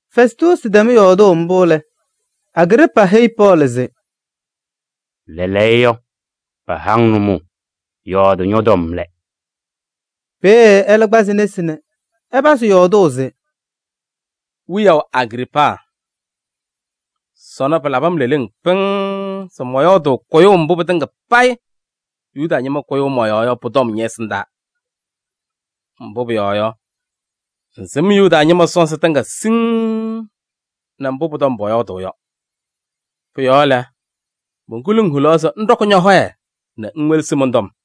Fɛstuusi tɛm yɔɔdʋʋ mbʋ lɛ, Agriipaa heyi Pɔɔlɩ se: “Lɛɛlɛɛyɔ, paha-ŋ nʋmɔʋ, yɔɔdɩ ñɔ-tɔm lɛ.” Peeye ɛlɛ kpazɩ nesi nɛ ɛpazɩ yɔɔdʋʋ se: “Wiyaʋ Agriipaa! Sɔnɔ pɩlabɩ-m leleŋ pɩŋŋ se mɔyɔɔdʋʋ kʋyʋʋ mbʋ pɩtɩŋa payɩ Yuda ñɩma kʋyʋʋ mɔ-yɔɔ yɔ pʋ-tɔm ñɛ-ɛsɩndaa. Mbʋ pʋyɔɔ yɔ, ŋsɩm Yuda ñɩma sɔnzɩ tɩŋa siŋŋ nɛ mbʋ pʋ-tɔm pɔyɔɔdʋʋ yɔ. Pʋ-yɔɔ lɛ, monkuluu-ŋ hulaɣ se ŋɖɔkɩ ñɔ-hɔyɛ nɛ ŋwelesi mɔn-tɔm.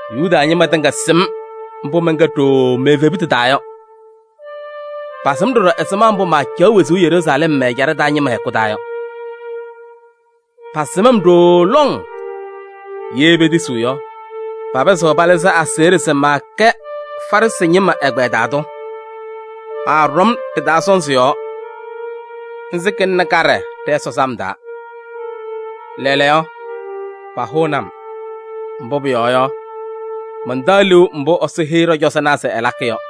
Yuda ñɩma tɩŋa sɩm mbʋ mɛnkɛ ɖooo me-evebutu taa yɔ. Pasɩm ɖɔɖɔ ɛzɩma mbʋ maacaɣ wezuu Yeruusalɛm mɛ-ɛjaɖɛ taa ñɩma hɛkʋ taa yɔ. Pasɩm-m ɖooo lɔŋ, ye petisiɣ yɔ, papɩzɩɣ palɩzɩ aseɣɖe se maakɛ Farɩsɩ ñɩma ɛgbɛyɛ taa tʋ. Maaɖɔm ɖɩ-taa sɔnzɩ yɔɔ. Nzɩ kɩlɩnɩ kaɖɛ ɖɛ-Ɛsɔ sam taa. Lɛɛlɛɛyɔ, pahʋʋnɩ-m. Mbʋ pʋyɔɔ yɔ, mantaɣ liu mbʋ Ɛsɔ heyi ɖɔ-cɔzɔnaa se ɛlakɩ yɔ.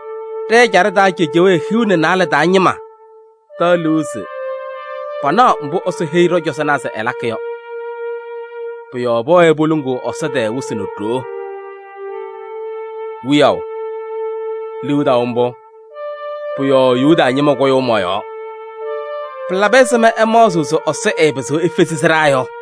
Ɖɛ-ɛjaɖɛ taa cejewee hiu nɛ naalɛ taa ñɩma taɣ liu se panaɣ mbʋ Ɛsɔ heyi ɖɔ-cɔzɔnaa se ɛlakɩ yɔ. Pʋ-yɔɔ pɛwɛɛ poluŋuu Ɛsɔ tɛɛ wɩsɩ nɛ ɖoo. Wiyaʋ! Liu taʋ mbʋ, pʋ-yɔɔ Yuda ñɩma kʋyʋʋ mɔ-yɔɔ. Pɩlabɩ ɛzɩma ɩmaɣzɩɣ se Ɛsɔ ɛɛpɩzɩɣ efezi sɩɖaa yɔ?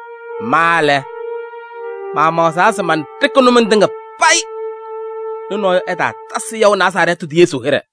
Ma lɛ, maamaɣzaa se manɖɩkɩ nʋmɔŋ tɩŋa payɩ nɛ nɔɔyʋ ɛtaatasɩ yaʋ Nazarɛɛtɩ tʋ Yesu hɩɖɛ.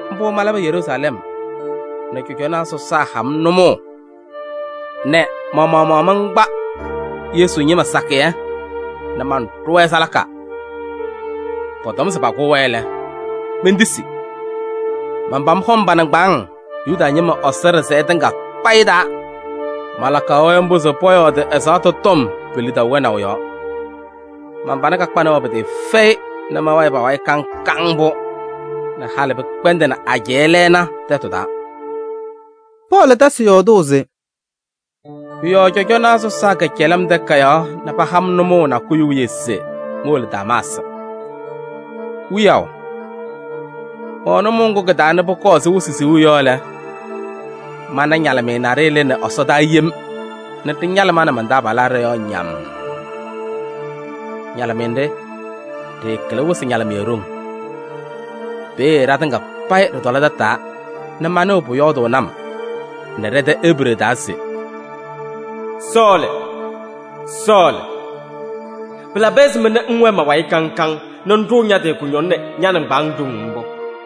Mbʋ malabɩ Yeruusalɛm nɛ cɔjɔnaa sɔsaa ha-m nʋmɔʋ nɛ ma-maɣmaɣ mankpa Yesu ñɩma sakɩyɛ nɛ manɖʋ-wɛ salaka. Pɔtɔm se pakʋʋ-wɛ lɛ, mentisi. Manpam hɔm pa-nɩŋgbaaŋ Yuda ñɩma Ɛsɔ ɖɩsɛyɛ tɩŋa payɩ taa. Malakaɣ-wɛ mbʋ se pɔyɔɔdɩ ɛzaɣtʋ tɔm pe-lidaʋ wɛnaʋ yɔɔ. Man-pana kakpanɩ-wɛ pɩtɩɩfɛyɩ nɛ mɛwɛɛ pa-wayɩ kaŋ kaŋ mbʋ nɛ halɩ pɩkpɛndɩnɩ ajɛɛ lɛɛna tɛtʋ taa.” Pɔɔlɩ tasɩ yɔɔdʋʋ se: “Pʋ-yɔɔ cɔjɔnaa sɔsaa kɛcɛlɩ-m takayaɣ nɛ paha-m nʋmɔʋ nakʋyʋ wiye se mowolo Damaasɩ. Wiyaʋ! Mɛwɛ nʋmɔʋ ŋgʋ kɩ-taa nɛ pʋkɔɔ ɛzɩ wɩsɩ siɣu yɔ lɛ, mana ñalɩmɩyɛ naɖɩyɛ lɩnɩ ɛsɔdaa yem nɛ ɖɩñalɩ ma nɛ man-taabalaa ɖɔ-yɔɔ ñammm. Ñalɩmɩyɛ nɖɩ, ɖɩɩkɩlɩ wɩsɩ ñalɩmɩyɛ ɖoŋ. Peeye ɖatɩŋa payɩ ɖɩtɔlɩ tataa nɛ manɩɣ pʋyɔɔdʋʋnɩ-m nɛ ɖɛ-tɛ Ebree taa se: ‘Sɔɔlɩ! Sɔɔlɩ! Pɩlabɩ ɛzɩma nɛ ŋwɛɛ ma-wayɩ kaŋ kaŋ nɛ ŋɖʋʋ ña-tɩ kʋñɔŋ nɛ ña-nɩŋgbaaŋ ɖoŋ mbʋ?’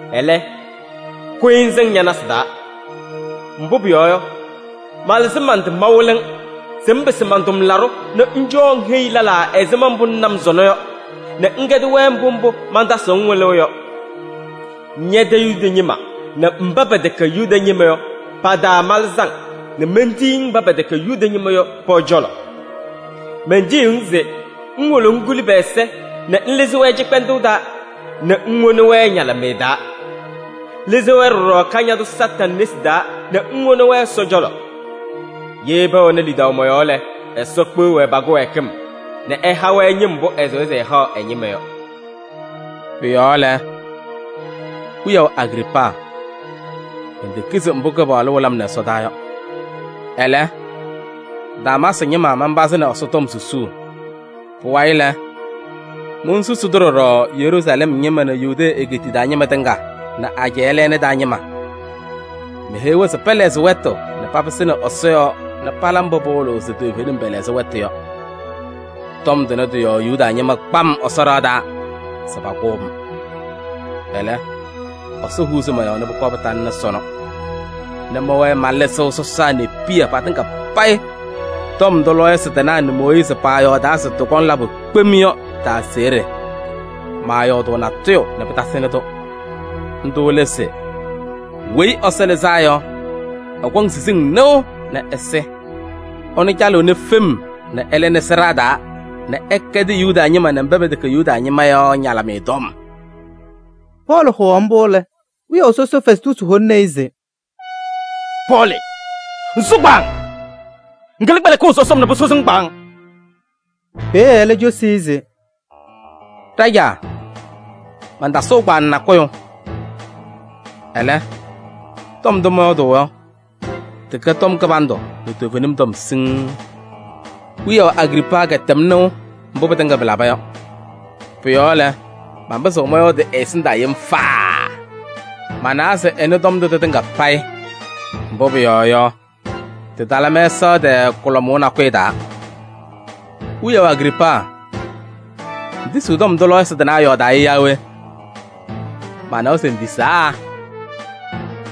Ɛlɛ, kʋyɩ ŋsɩŋ ña-nasɩ taa. Mbʋ pʋyɔɔ yɔ, malɩzɩ man-tɩ mawɩlɩ-ŋ se ŋpɩsɩ man-tʋmlaɖʋ nɛ ŋcɔɔ ŋheyi lɛlaa ɛzɩma mbʋ ŋna-m sɔnɔ yɔ nɛ ŋkɛdɩ-wɛ mbʋ mbʋ mantasɩɣ-ŋ wɩlʋʋ yɔ. Ñɛ-tɛ Yuda ñɩma nɛ mba pɛtɛkɛ Yuda ñɩma yɔ pa-taa malɩzɩ-ŋ nɛ mentiyi-ŋ mba pɛtɛkɛ Yuda ñɩma yɔ pɔ-cɔlɔ. Mentiyiɣ-ŋ se ŋwolo ŋkuli pɛ-ɛza nɛ ŋlɩzɩ-wɛ cɩkpɛndʋʋ taa nɛ ŋwoni-wɛ ñalɩmɩyɛ taa. Lɩzɩ-wɛ ɖɔɖɔ Kañadʋ Satanɩ nesi taa nɛ ŋwoni-wɛ Ɛsɔ cɔlɔ. Ye pɛwɛnɩ lidaʋ mɔ-yɔɔ lɛ, Ɛsɔ kpeɣ-wɛ pa-kɩwɛɛkɩm nɛ ɛha-wɛ ñɩm mbʋ ɛsɩwa se ɛhaɣ ɛ-ñɩma yɔ.’” “Pʋ-yɔɔ lɛ, wiyaʋ Agriipaa! Mentekizi mbʋ Kɩpaɣlʋ wɩlɩ-m nɛ ɛsɔdaa yɔ. Ɛlɛ, Damaasɩ ñɩma manpazɩnɩ Ɛsɔtɔm susuu. Pʋwayɩ lɛ, monsusi-tʋ ɖɔɖɔ Yeruusalɛm ñɩma nɛ Yudee egeetiye taa ñɩma tɩŋa nɛ ajɛɛ lɛɛna taa ñɩma. Meheyi-wɛ se pɛlɛɣzɩ wɛtʋ nɛ papɩsɩnɩ Ɛsɔ yɔɔ nɛ pala mbʋ pɩwɩlɩɣ se toovenim pɛlɛɣzɩ wɛtʋ yɔ. Tɔm tʋnɛ tɩ-yɔɔ Yuda ñɩma kpa-m Ɛsɔ ɖɩɣa taa se pakʋʋ-m. Ɛlɛ, Ɛsɔ huuzi mɔ-yɔɔ nɛ pʋkɔɔ pɩtalɩnɩ sɔnɔ nɛ mɛwɛɛ malɩzɩɣ sɔsaa nɛ piya patɩŋa payɩ tɔm ndʋ lɔɔyɩsɩ tɩnaa nɛ Mooyiizi pɔyɔɔdaa se tɩkɔŋ labʋ kpem yɔ tɩ-aseɣɖe. Maayɔɔdʋʋ natʋyʋ nɛ pɩtasɩnɩ-tʋ. Ndʋ lɛ se: ‘Weyi Ɛsɔ Lɩzaa Yɔ, ɛkɔŋ siziŋ nɩʋ nɛ ɛsɩ. Ɛnʋ calɩɣnɩ fem nɛ ɛlɩnɩ sɩɖaa taa nɛ ɛkɛdɩ Yuda ñɩma nɛ mba pɛtɛkɛ Yuda ñɩma yɔ ñalɩmɩyɛ tɔm.’” Pɔɔlɩ hʋwaɣ mbʋ lɛ, wiyaʋ sɔsɔ Fɛstuusi holini-i se: “Pɔɔlɩ ŋsʋ kpaaŋ! Ŋkɩlɩ kpɛlɩkʋʋ sɔsɔm nɛ pʋsʋsɩ-ŋ kpaaŋ!” Peeye ɛlɛ cosi-i se: “Ɖajaa! Mantasʋʋ kpaaŋ nakʋyʋ, ɛlɛ, tɔm ndʋ mɔyɔɔdʋʋ yɔ, tɩkɛ tɔm kɩbandʋ nɛ toovenim tɔm siŋŋ. Wiyaʋ Agriipaa kɛtɛm nɩʋ mbʋ pɩtɩŋa pɩlaba yɔ. Pʋ-yɔɔ lɛ, manpɩzɩɣ mɔyɔɔdɩ ɛ-ɛsɩndaa yem faaa. Manawa se ɛnɩ tɔm ndʋ tɩtɩŋa payɩ. Mbʋ pʋyɔɔ yɔ, tɩtala mɛsaɣ tɛɛ kʋlɔmʋʋ nakʋyʋ taa. Wiyaʋ Agriipaa! Ŋtisiɣ tɔm ndʋ lɔɔyɩsɩ tɩnaa yɔɔdaa yɔ yaa we? Manawa se ŋtisaa!”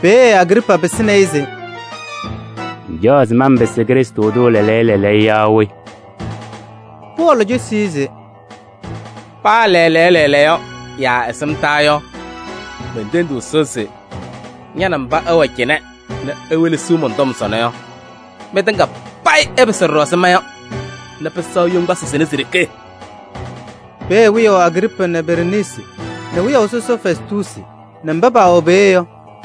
Peeye Agriipaa pɩsɩnɩ-ɩ se: “Ŋcaɣ se manpɩsɩ Krɩstʋ tʋ lɛɛlɛɛyɔ lɛɛlɛɛyɔ yaa we?” Pɔɔlɩ cosi-i se: “Paa lɛɛlɛɛyɔ lɛɛlɛɛyɔ yaa ɛsɩmtaa yɔ, mentendiɣ Ɛsɔ se ña nɛ mba ɩwɛ cɩnɛ nɛ iwelesiɣ mɔn-tɔm sɔnɔ yɔ, mɩtŋa payɩ ɩpɩsɩ ɖɔɖɔ ɛzɩ ma yɔ nɛ pɩsɛɣ yoŋgbasɩ sɩnɛ si-ɖeke!” Peeye wiyaʋ Agriipaa nɛ ɛ-halʋ Bereniisi nɛ wiyaʋ sɔsɔ Fɛstuusi nɛ mba paawɛ peeye yɔ,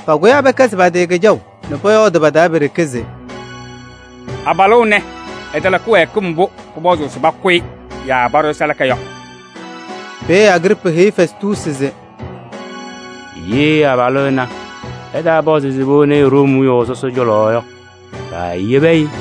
pakʋyaa pɛkɛzɩ pa-tɩ kɩjaʋ nɛ pɔyɔɔdʋʋ pa-taa pe-ɖeke se: “Abalʋ ɛnɛ, ɛtala kɩwɛɛkɩm mbʋ pʋpɔzʋʋ se pakʋ-ɩ yaa paɖʋ-ɩ salaka yɔ.” Peeye Agriipaa heyi Fɛstuusi se: “Ye abalʋ ɛnɛ ɛtaapɔzɩ se patanɩ-ɩ Room wiyaʋ sɔsɔ cɔlɔ yɔ, paayebi-i!”